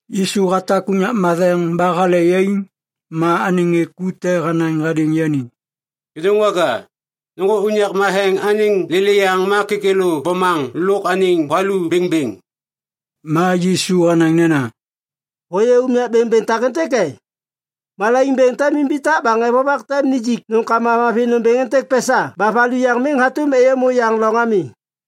Yisu hatak unyak matheŋ ba hale yaiŋ ma anêŋ ŋê ku te hanaŋ hadêŋ yani, “Kêdôŋwaga, nôŋgô unyak matheŋ anêŋ lêlêyaŋ ma kêkêlô bomaŋ lôk anêŋ valu bêŋbêŋ!” Ma Yisu hanaŋ nena, “Hôyê unyak bêŋbêŋ takêntêk e? Malaiŋ bêŋ tem imbitak ba ŋê vovak tem nijik nômkama mavi nômbêŋ êntêk pesa ba valu yaŋ miŋ hatôm êyômô yaŋ loŋ ami.”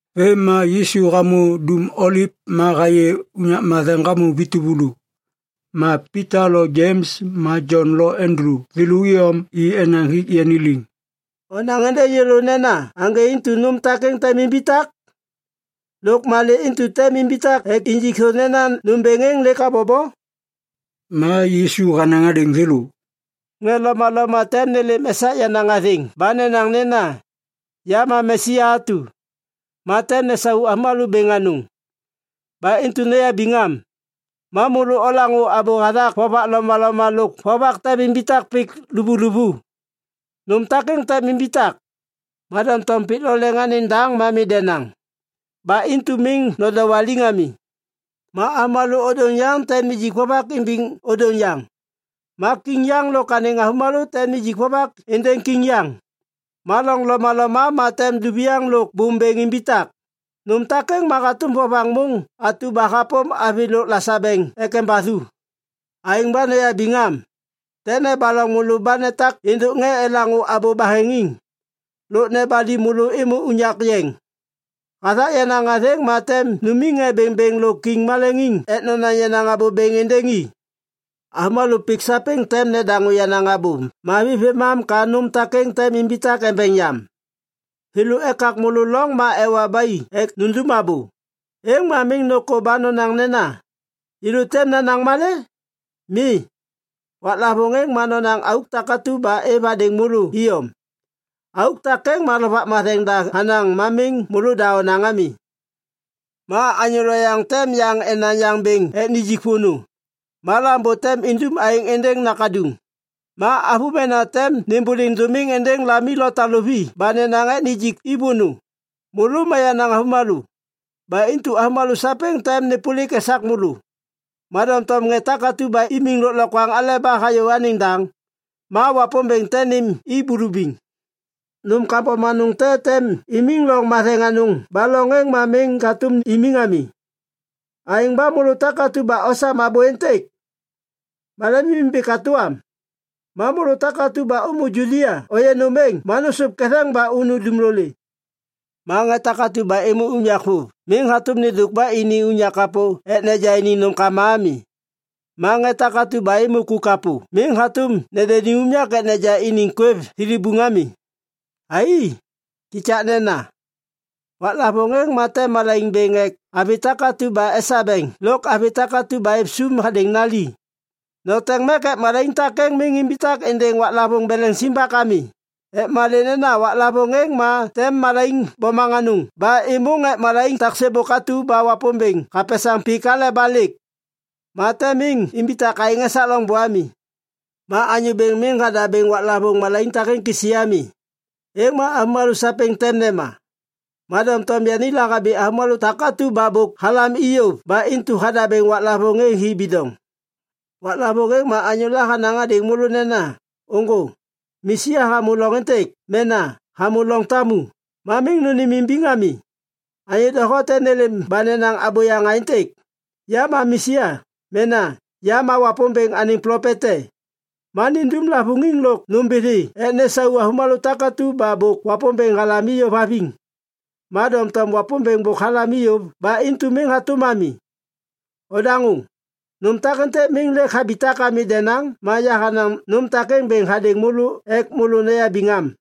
Vêm ma Yisu hamô Dum Oliv ma hayê unyak matheŋ hamô vi tuvulu. Ma Pita lo Jems ma Jon lo Andulu thêlô iyom i enaŋ hik yani liŋ, “Onaŋ êndêŋ yêlô nena aŋgê intu nôm takêŋ tem imbitak? Lôk malê intu tem imbitak ek injik thô nena nômbêŋ êŋ lêk habobo?” Ma Yisu hanaŋ hadêŋ thêlô, “Ŋê lomaloma tem nêlêm esak yenaŋ athêŋ ba nenaŋ nena, ‘Ya ma Mesia atu.’ Ma tem nesau avômalô bêŋ anôŋ. Ba intu noyabiŋ am. Ma môlô olaŋô abô hathak vovak lomaloma lôk vovak tem imbitak pik luvuluvu. Nôm takêŋ tem imbitak, ma doŋtom pik lo leŋ anêŋ daŋ ma mi denaŋ. Ba intu miŋ nodowaliŋ ami. Ma avômalô ôdôŋ yaŋ tem nijik vovak imbiŋ ôdôŋ yaŋ. Ma kiŋ yaŋ lôk anêŋ avômalô tem nijik vovak êndêŋ kiŋ yaŋ. Ma loŋ lomaloma ma tem duviaŋ lôk bôm bêŋ imbitak. Nôm takêŋ ma hatôm vovaŋ môŋ atu ba hapôm avi lôk lasabeŋ ek embathu. “Aêŋ ba noyabiŋ am. Tem nebaloŋ môlô ba netak êndôk ŋê elaŋô abô baheŋiŋ. Lôk nebali môlô êmô unyak yeŋ. Hathak yenaŋ athêŋ ma tem numiŋ ŋê bêŋbêŋ lôk kiŋ maleŋiŋ ek nonaŋ yenaŋ abô bêŋ êndêŋ i. Avômalô pik sapêŋ tem nedaŋô yenaŋ Abô Mavi vêmam ka nôm takêŋ tem imbitak embeŋ yam. Thêlô ekak môlô loŋ ma ewa ba i ek nundum abô, êŋ ma miŋ nôkô ba nonaŋ nena, ‘Yêlô tem nanaŋ malê?’ Mi. Waklavôŋ êŋ ma nonaŋ auk takatu ba êv hadêŋ môlô iyom. Auk takêŋ ma Lovak Matheŋ da hanaŋ ma miŋ môlôda onaŋ ami. “Ma anyô loyaŋ tem yaŋ enaŋ yaŋ bêŋ ek nijik vônô. Ma lambô tem indum aêŋ êndêŋ nakaduŋ. Ma avômena tem nêmbôliŋ dômiŋ êndêŋ lami lo taluvi ba nenaŋ ek nijik i vônô. Môlô ma yenaŋ avômalô. Ba intu avômalô sapêŋ tem nêpôlik esak môlô. Ma doŋtom ŋê takatu ba imiŋ lôklokwaŋ aleba hayô anêŋ daŋ, ma Wapômbêŋ tem nêm i bulubiŋ. “Nôm kambom anôŋ te tem imiŋ loŋ matheŋ anôŋ ba loŋ êŋ ma miŋ hatôm imiŋ ami. (Aêŋ ba môlô takatu ba osam abô êntêk, ma lemimimbi katô am.) Ma môlô takatu ba ômô Judia ôyê nôm êŋ ma nôsôv ketheŋ ba unu dumlolê. Ma ŋê takatu ba êmô unyak vôv miŋ hatôm nêndôk ba ini unyak kapô ek neja iniŋ nômkama ami. Ma ŋê takatu ba êmô ku kapô miŋ hatôm nendeni unyak ek neja iniŋ kwêv thilibuŋ ami. Ai, kikaknena. Waklavôŋ êŋ ma tem malaiŋ bêŋ ek avi takatu ba esabeŋ lôk avi takatu ba êv sôm hadêŋ nali. Noteŋ mek ek malaiŋ takêŋ miŋ imbitak êndêŋ waklavôŋ beleŋ simbak ami. Ek malê nena waklavôŋ êŋ ma tem malaiŋ bomaŋ anôŋ ba êmôŋ ek malaiŋ tak sêbôk atu ba Wapômbêŋ hapesaŋ pik aleba lêk. Ma tem miŋ imbitak aêŋ esak loŋbô ami. Ma Anyô Bêŋ miŋ hadabêŋ waklavôŋ malaiŋ takêŋ kisi ami, êŋ ma avômalô sapêŋ tem nema. Ma doŋtom yani lahabi avômalô takatu ba bôk halam i yôv ba intu hadabêŋ waklavôŋ êŋ hi bidoŋ. “Waklavôŋ êŋ ma anyôla hanaŋ hadêŋ môlô nena, ‘Ôŋgô, Mesia hamô loŋ êntêk’ mena ‘hamô loŋ tamu,’ ma miŋ nônêmimbiŋ ami. Anyô doho tem nêlêm ba nenaŋ abôyaŋ aêntêk, ‘Ya ma Mesia’ mena ‘Ya ma Wapômbêŋ anêŋ plopet te’, ma nindum lavôŋiŋ lôk nômbithi ek nesau avômalô takatu ba bôk Wapômbêŋ halam i yôv haviŋ. Ma doŋtom Wapômbêŋ bôk halam i yôv ba intu miŋ hatôm ami. Odaŋô! Nôm takêntêk miŋ lêk habitak ami denaŋ ma yahanaŋ nôm takêŋ bêŋ hadêŋ môlô ek môlô noyabiŋ am.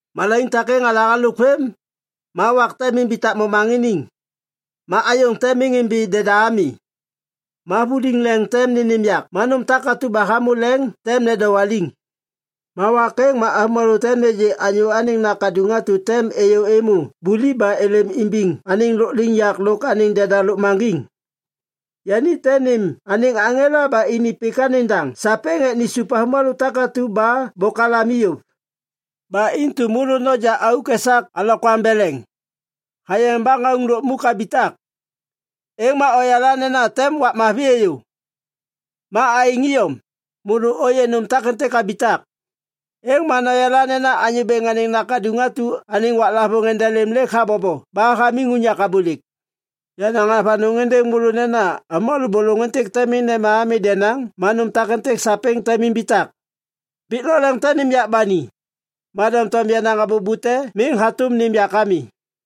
“Malaiŋ takêŋ hale halôk vêm, “‘ma wak tem imbitak momaŋiniŋ, ma ayôŋ tem miŋ imbi deda ami; ma vuliŋ leŋ tem nênêm yak ma nôm takatu ba hamô leŋ tem nedowaliŋ.’ “Ma wak êŋ ma avômalô tem nêgê Anyô Anêŋ Nakaduŋ atu tem êyô êmô buliv ba êlêm imbiŋ anêŋ lôkliŋyak lôk anêŋ deda lôkmaŋgiŋ. Yani tem nêm anêŋ aŋela ba ini pik anêŋ daŋ sapêŋ ek nisup avômalô takatu ba bôk halam i yôv. “Ba intu môlô noja auk esak alokwaŋ beleŋ. Hayeŋ ba ŋauŋ lukmuk habitak, êŋ ma oyala nena tem wak mavi êyô. Ma aêŋ iyom, môlô ôyê nôm takêntêk habitak, êŋ ma noyala nena Anyô Anêŋ Nakaduŋ atu anêŋ waklavôŋ endelêm lêk habobo ba hamiŋ unyak abôlêk. Yanaŋ avanôŋ êndêŋ môlô nena avômalô bôlôŋ êntêk tem miŋ nema ami denaŋ ma nôm takêntêk sapêŋ tem imbitak. Pik lôk leŋ tem nêm yak ba ni, ma doŋtom yenaŋ abô bute miŋ hatôm nêm yak ami.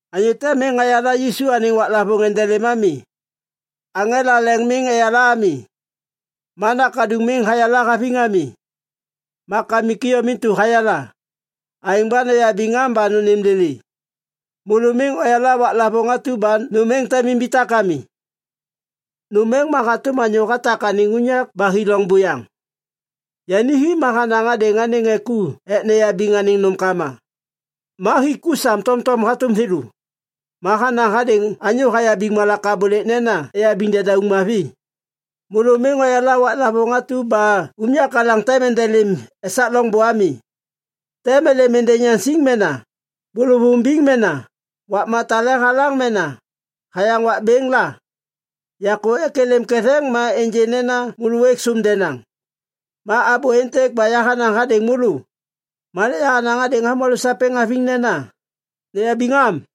“Anyô te miŋ hayala Yisu anêŋ waklavôŋ endelêm ami. Aŋela leŋ miŋ eyala ami, ma Nakaduŋ miŋ hayala haviŋ ami. Ma Kamik iyom intu hayala. Aêŋ ba noyabiŋ am ba nônêm lêlê! Môlô miŋ oyala waklavôŋ atu ba nôm êŋ tem imbitak ami. Nôm êŋ ma hatôm anyô hatak anêŋ unyak ba hi loŋ buyaŋ. Yani hi ma hanaŋ hadêŋ anêŋ ŋê ku ek neyabiŋ anêŋ nômkama. Ma hik ku sam tomtom hatôm thêlô. Ma hanaŋ hadêŋ anyô hayabiŋ malak abôlêk nena eyabiŋ dedauŋ mavi. “Môlô miŋ oyala waklavôŋ atu ba unyak alaŋ tem endelêm esak loŋbô ami. Tem êlêm êndêŋ yaŋsiŋ mena bôlôvôŋ biŋ mena wakma tale halaŋ mena hayaŋ wak bêŋ la. Yakô ek êlêm ketheŋ ma ênjê nena môlô ôêk sôm denaŋ. Ma abô êntêk ba yahanaŋ hadêŋ môlô, ma lêk yahanaŋ hadêŋ avômalô sapêŋ haviŋ nena, ‘Noyabiŋ am!’”